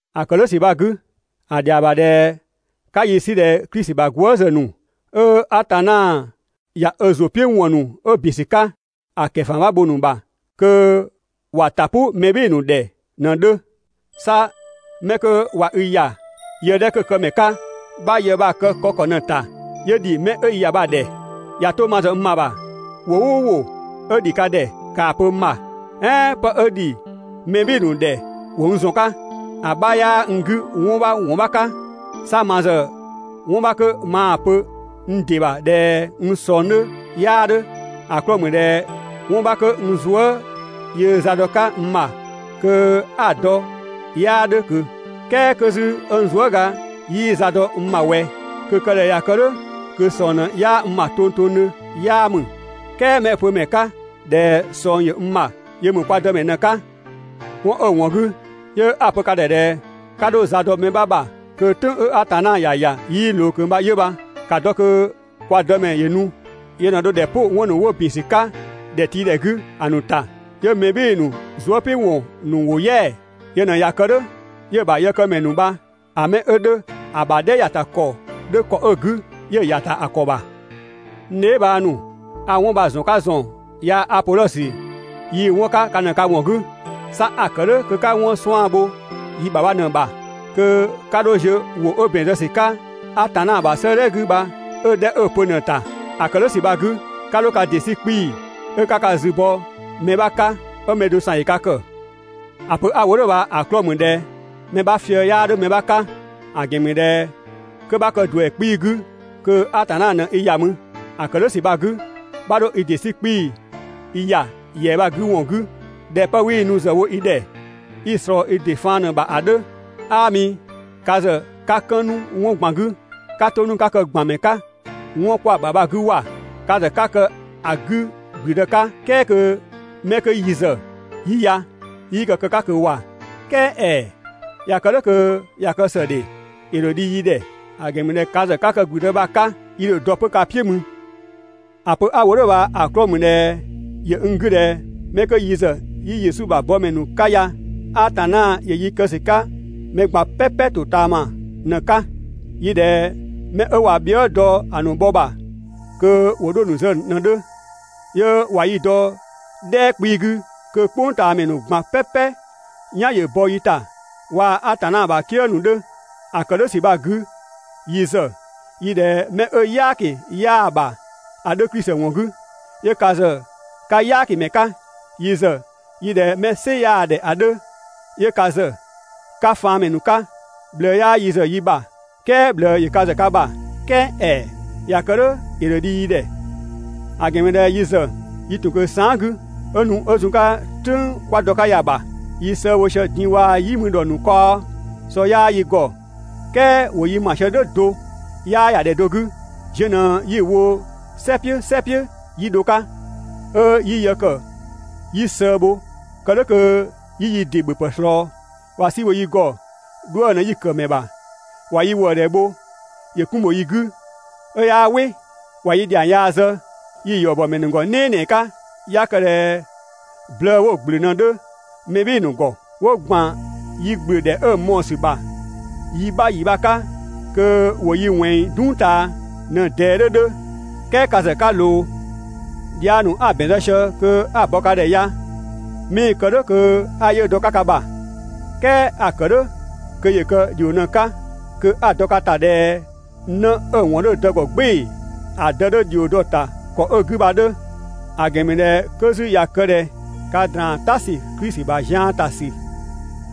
‑A ‑kë "dhʋ̈ ‑sü bha‑ 'gü, ‑a ‑dhɛa ‑bha ꞊dhɛ 'ka yi 'sü ꞊dhɛ Klisi ‑bha gwëëzë ‑nu, 'ö Atanna ꞊ya ö ‑zʋ "piʋ̈ ‑wɔn ‑nu 'ö ‑bin ‑sü 'ka ‑a ‑kɛfama bho‑ ‑nu ‑bha kö ‑wa ‑ta "pʋ mɛ "bhɩɩ‑ ‑nu ‑dhɛ ꞊në‑ 'dhö. 'Sa 'mɛ 'kö ꞊wa i ‑ya yë 'dhɛ 'kö‑ këmɛ 'ka, 'bha‑ yë bha‑ kë‑ kë ‑kɔ ꞊në‑ ‑ta 'yö ‑dhi 'mɛ i ‑ya bha‑ ‑dhɛ. ꞊Ya 'to ma ‑zë n ‑bha ‑bha, ‑wʋ "ʋʋ ‑wʋ 'ö ‑dhi ka ‑dhɛ ‑kaa pö n ‑bha, "ɛɛn 'pë 'ö ‑dhi mɛ "bhɩɩ‑ ‑nu ‑dhɛ ‑wo n ‑zɔn 'ka, ‑a 'bha 'yaa n 'gü 'wɔn 'bha ‑wɔn 'bha 'ka. 'Sa ma ‑zë 'wɔn 'bha 'kö maa ‑pö n ‑dɩ ‑bha ꞊dhɛ n ꞊sɔng 'dhö 'yaa 'dhö, ‑a 'klɔɔ‑ ‑mü ꞊dhɛ 'wɔn 'bha kö n zuë" yöö za dɔ‑ 'ka n ‑bha kö 'a‑ dɔ 'yaa 'dhö ꞊kö. "Kɛɛ 'kö 'zü n zuëga 'yii za dɔ n ‑bha ꞊wɛ, kö‑ kë ꞊dhɛ ꞊ya kë "dhʋ̈ kö ꞊sɔng ꞊në 'yaa n ‑bha tongtongdhö 'yaa ‑mü. "Kɛɛ 'mɛ 'ö‑ pö ‑mɛ 'ka ꞊dhɛ ꞊sɔng ‑yö n ‑bha yö ‑mü kwa Dëmɛ ꞊në‑ 'ka. 'Wɔn 'ö‑ ‑wɔn 'gü 'yö 'a‑ pö ka ‑dhɛ ꞊dhɛ 'ka 'dho za dɔ mɛ 'bha ‑bha kö "tʋ̈ng 'ö Atanna ‑ya ‑ya 'yii ꞊loo ꞊kö bha 'yö bha. ‑Ka dɔ kö kwa Dëmɛ ‑yö nu. Yö ꞊në dho ‑dhɛ "pʋ 'wɔn ‑nu 'wo ‑bin ‑sü 'ka ‑dhɛtiidhɛ 'gü ‑a ‑nu ‑ta, 'yö mɛ "bhɩɩ‑ ‑nu zuëpiʋ̈wɔn ‑nu ‑wo "yɛa‑. Yö ꞊në ꞊ya kë "dhʋ̈ 'yö‑ ‑bha yëkëmɛ ‑nu bha‑ 'mɛ 'ö 'dhö ‑a ‑bha "dhɛ ‑ya ‑ta ‑kɔ 'dhö ‑kɔ 'ö‑ 'gü, 'yö‑ ‑ya ‑ta ‑a ‑kɔ ‑bha. N dheebhang ‑nu, a 'wɔn bha‑ ‑zɔn 'ka ‑zɔn yaa‑ Apodhɔsö yii‑ 'wɔn 'ka ka ꞊në ka ‑wɔn 'gü. 'Sa a‑ ‑kë "dhʋ̈ kö 'ka 'wɔn 'suan‑ bho yi ‑bha bha ꞊në‑ ‑bha, kö 'ka 'dho ziö ‑wʋ 'ö ‑bɛn zë ‑sü 'ka Atanna ‑bha 'sëëdhɛ 'gü bha 'ö‑ 'dhɛ 'ö‑ pö ꞊në‑ ‑ta. ‑A ‑kë "dhʋ̈ ‑sü bha‑ 'gü, 'ka 'dho ka ‑dɩ 'sü 'kpii‑ 'ö 'ka ka zü bɔ mɛ 'bha 'ka 'ö mɛ do ‑san ‑yö ka ‑kë. ‑A pö 'a‑ wo "dhʋ̈ bha‑ 'klɔɔ‑ ‑mü ꞊dhɛ mɛ 'bha fië‑ 'yaa 'dhö mɛ 'bha 'ka. ‑A ‑gɛn ‑mü ꞊dhɛ 'kö 'bha kë ‑duɛ 'kpii‑ 'gü kö Atanna ꞊në i ‑ya mü. ‑A ‑kë "dhʋ̈ ‑sü bha‑ 'gü, 'bha 'dho i ‑dɩ 'sü 'kpii‑ i ‑ya ‑yɛa bha‑ 'gü ‑wɔn 'gü ꞊dhɛ 'pë 'wii‑ nu ‑zë wo i ‑dhɛ, 'i‑ ꞊slɔɔ i ‑dɩ faan ꞊në‑ ‑bha ‑a 'dhö. 'Aami, ka ‑zë 'ka 'kën 'nu 'wɔn ꞊gban 'gü, 'ka 'to 'nu 'ka kë ‑gbanmɛ 'ka 'wɔn 'kwa‑ ‑bha bha‑ 'gü ‑wa! Ka ‑zë 'ka kë‑ 'gü ‑gblüdë 'ka "kɛɛ kö 'mɛ 'kö yi ‑zë 'yi ya 'yii kë‑ 'ka ꞊kö ‑wa! "Kɛɛ ‑ɛɛ, ꞊ya kë "dhʋ̈ kö ꞊ya kë ‑së ‑dhe, ‑yö ‑dho dhi yi ‑dhɛ, ‑a ‑gɛn ‑mü ꞊dhɛ ka ‑zë 'ka kë‑ ‑gblüdë bha‑ 'ka yi ‑dho dɔ 'pö ka "piʋ̈ mü. ‑A pö 'a‑ wo "dhʋ̈ bha‑ 'klɔɔ‑ ‑mü ꞊dhɛ ‑yö n 'gü ꞊dhɛ 'mɛ 'ö yi ‑zë 'yi Yesu ‑bha bɔmɛ ‑nu 'ka ya, Atanna ‑yö yi kë ‑sü 'ka mɛ ꞊gban "pɛpɛ ‑totaama ꞊në‑ 'ka. Yi ꞊dhɛ 'mɛ 'ö ꞊wa bhië" dɔ‑ ‑nu bhɔ ‑bha kö ‑wo 'dho‑ ‑nu zë ꞊në‑ 'dhö, 'yö ꞊wa yi dɔ "dhɛɛ 'kpii‑ 'gü kö "kpʋngtaamɛ ꞊gban "pɛpɛ "yan ‑yö bɔ yi ‑ta waa‑ Atanna ‑bha "kië ‑nu 'dhö. ‑A ‑kë "dhʋ̈ ‑sü bha‑ 'gü yi ‑zë yi ꞊dhɛ 'mɛ 'ö "yaaki 'yaa‑ ‑bha ‑a 'dhö Klisi ‑wɔn 'gü, 'yö ka ‑zë 'ka "yaakimɛ 'ka! Yi ‑zë yi ꞊dhɛ 'mɛ "sɩ 'yaa ‑dhɛ ‑a 'dhö, 'yö ka ‑zë 'ka faanmɛ ‑nu 'ka! ꞊Bhlëë 'yaa yi ‑zë yi bha, "kɛɛ ꞊bhlëë ‑yö ka ‑zë ka ‑bha! ("Kɛɛ ‑ɛɛ! ꞊Ya kë "dhʋ̈ ‑yö ‑dho dhi yi ‑dhɛ), ‑a ‑gɛn ‑mü ꞊dhɛ yi ‑zë yi ‑tun ꞊kö saan" 'gü 'ö nu 'ö zun‑ 'ka "tʋ̈ng 'kwa dɔ‑ 'ka ya‑ ‑bha, yi sëë bho sië din‑ waa‑ "yi mü ‑dhɔ ‑nu kaɔ, sɔ 'yaa yi ‑gɔ, "kɛɛ ‑wo yi ‑ma sië "dhʋ̈ do, 'yaa ‑ya ‑dhɛ do 'gü, ziö ꞊në 'yi‑ wo "sɛ "piʋ̈ "sɛ "piʋ̈ 'yi dho‑ 'ka. 'Ö 'yi yë ‑kë 'yi sëë bho kë "dhʋ̈ kö 'yi yi ‑dɩ ‑bhöpë ꞊slɔɔ. ꞊Wa "si bho yi ‑gɔ, 'dhuë‑ ꞊në 'yi‑ kë‑ ‑mɛ ‑bha. ꞊Wa yi ‑wëëdhɛ bho ‑yö 'kun ‑bho yi 'gü 'ö 'yaa "wɩ. ꞊Wa yi ‑dhiang yaa zë yi‑ ‑yɔ ‑bɔ ‑mɛ ‑nu ‑gɔ "nɛɛnɛɛ 'ka. 'Ya kë ꞊dhɛ blëë 'wo‑ ‑gblö ꞊në‑ 'dhö mɛ "bhɩɩ‑ ‑nu ‑gɔ, 'wo ‑gban yi ‑gblö ‑dhɛ 'ö‑ mɔɔ‑ ‑sü ‑bha yi 'bha ‑yi 'bha 'ka kö ‑wo yi ꞊wɛnng "dung ꞊taa ꞊në‑ ꞊dɛɛ 'dhö 'dhö ("kɛɛ ka ‑zë 'ka ꞊loo). Dhiang ‑nu 'a‑ ‑bɛn zë sië kö 'a‑ bɔ ka ‑dhɛ ya 'mii‑ kë "dhʋ̈ kö 'a 'yiʋ̈‑ dɔ‑ 'ka ka ‑bha, "kɛɛ a‑ ‑kë "dhʋ̈ kö ‑yö kë ‑dhio ꞊në‑ 'ka kö 'a‑ dɔ ka ‑ta ꞊dhɛ 'në 'ö‑ ‑wɔn 'dhö‑ dë ‑gɔ "gbɩɩ‑, ‑a dë 'dhö ‑dhio dɔ‑ ‑ta ‑kɔ 'ö‑ 'gü bha‑ 'dhö. ‑A ‑gɛn ‑mü ꞊dhɛ 'kö 'zü ꞊ya kë ꞊dhɛ ka ‑draan "ta ‑sü Klisi ‑bha zian ‑ta ‑sü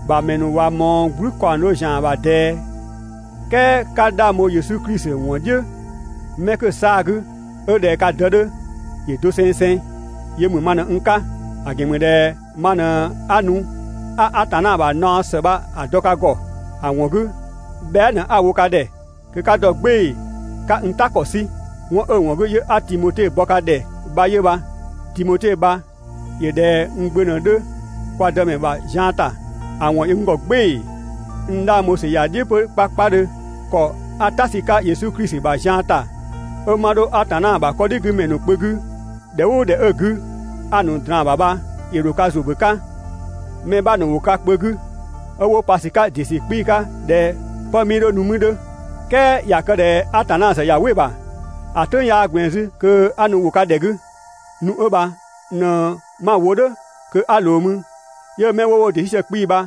‑bha ‑mɛ ‑nu ꞊wa ꞊mɔɔ "gblü ‑kaɔng do ‑zian ‑bha ꞊dɛɛ, "kɛɛ 'ka 'dhang bho Yesu Klisi ‑wɔn "dhiʋ̈ mɛ 'kö‑ 'saa‑ 'gü, 'ö ꞊dhɛ ka dë 'dhö, ‑yö dosengseng. Yö ‑mü ma ꞊në n 'ka, ‑a ‑gɛn ‑mü ꞊dhɛ ma ꞊në 'a nu 'a Atanna ‑bha naɔ ‑së bha‑ dɔ ka ‑gɔ. ‑A ‑wɔn 'gü, bhɛa" ꞊në 'a‑ wo ka ‑dhɛ kö 'ka dɔ "gbɩɩ‑ 'ka n "ta ‑kɔ 'sü. 'Wɔn 'ö‑ 'wɔn 'gü 'yö 'a Timote bɔ ka ‑dhɛ bha 'yö bha. Timote bha ‑yö ꞊dhɛ n gbö ꞊në‑ 'dhö kwa Dëmɛ ‑bha zian ‑ta. ‑A ‑wɔn ‑yö n ‑gɔ "gbɩɩ‑. N 'dhang bho ‑sü ‑ya "dhiʋ̈ 'pö 'kpakpadhö. ‑Kɔ 'a "ta sü‑ 'ka Yesu Klisi ‑bha zian ‑ta 'ö 'ma 'dho Atanna ‑bha 'Kɔdhigümɛ ‑nu kpö 'gü ‑dhɛ "ʋʋ ‑dhɛ 'ö‑ 'gü 'a‑ ‑nu ꞊draan‑ ‑bha bha, ‑yö ‑dho ka ‑zʋ ‑bö 'ka. Mɛ 'bha ‑nu ‑wo ka kpö 'gü 'ö ꞊wa pa ‑dɩ ‑sü 'kpii‑ 'ka ꞊dhɛ 'pë 'mii 'dho nu mü‑ 'dhö. "Kɛɛ ꞊ya kë ꞊dhɛ Atanna ‑zë ꞊ya "wɩ‑ ‑bha, ‑a "tʋ̈ng 'yaa ꞊gblɛɛn ‑zü kö 'a nu ‑wo ka ‑dhɛ 'gü. Nu 'ö bha ꞊në 'ma‑ wo "dhʋ̈ kö 'a ꞊loo mü, 'yö 'mɛ 'wo wo ‑dɩ 'sü sië 'kpii‑ bha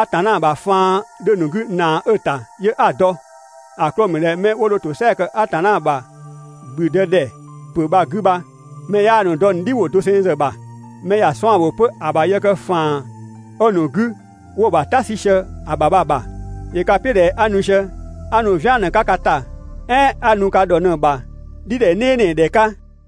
Atanna ‑bha faan 'dhö‑ ‑nu 'gü ‑naa 'ö‑ ‑ta 'yö 'a‑ dɔ. ‑A 'klɔɔ‑ ‑mü ꞊dhɛ 'mɛ 'wo dho ‑tosɛa ‑kë Atanna ‑bha ‑gblüdëdhɛpö bha‑ 'gü bha, mɛ 'yaa‑ ‑nu dɔ‑ ‑nu "dhiwʋ doseng ‑zë ‑bha, mɛ ‑ya ‑nu 'suan‑ ‑bho 'pö ‑a ‑bha yë kë ‑faan 'ö‑ ‑nu 'gü 'wo‑ ‑bha "ta 'sü sië‑ ‑bha bha‑ ‑bha. ‑Yö ka "piʋ̈ ꞊dhɛ 'a nu sië 'a nu "vian ꞊në‑ 'ka ka ‑ta "ɛɛn 'a nu ka ‑dhɔ ꞊në‑ ‑bha "dhidhɛ "nɛɛnɛɛdhɛ 'ka?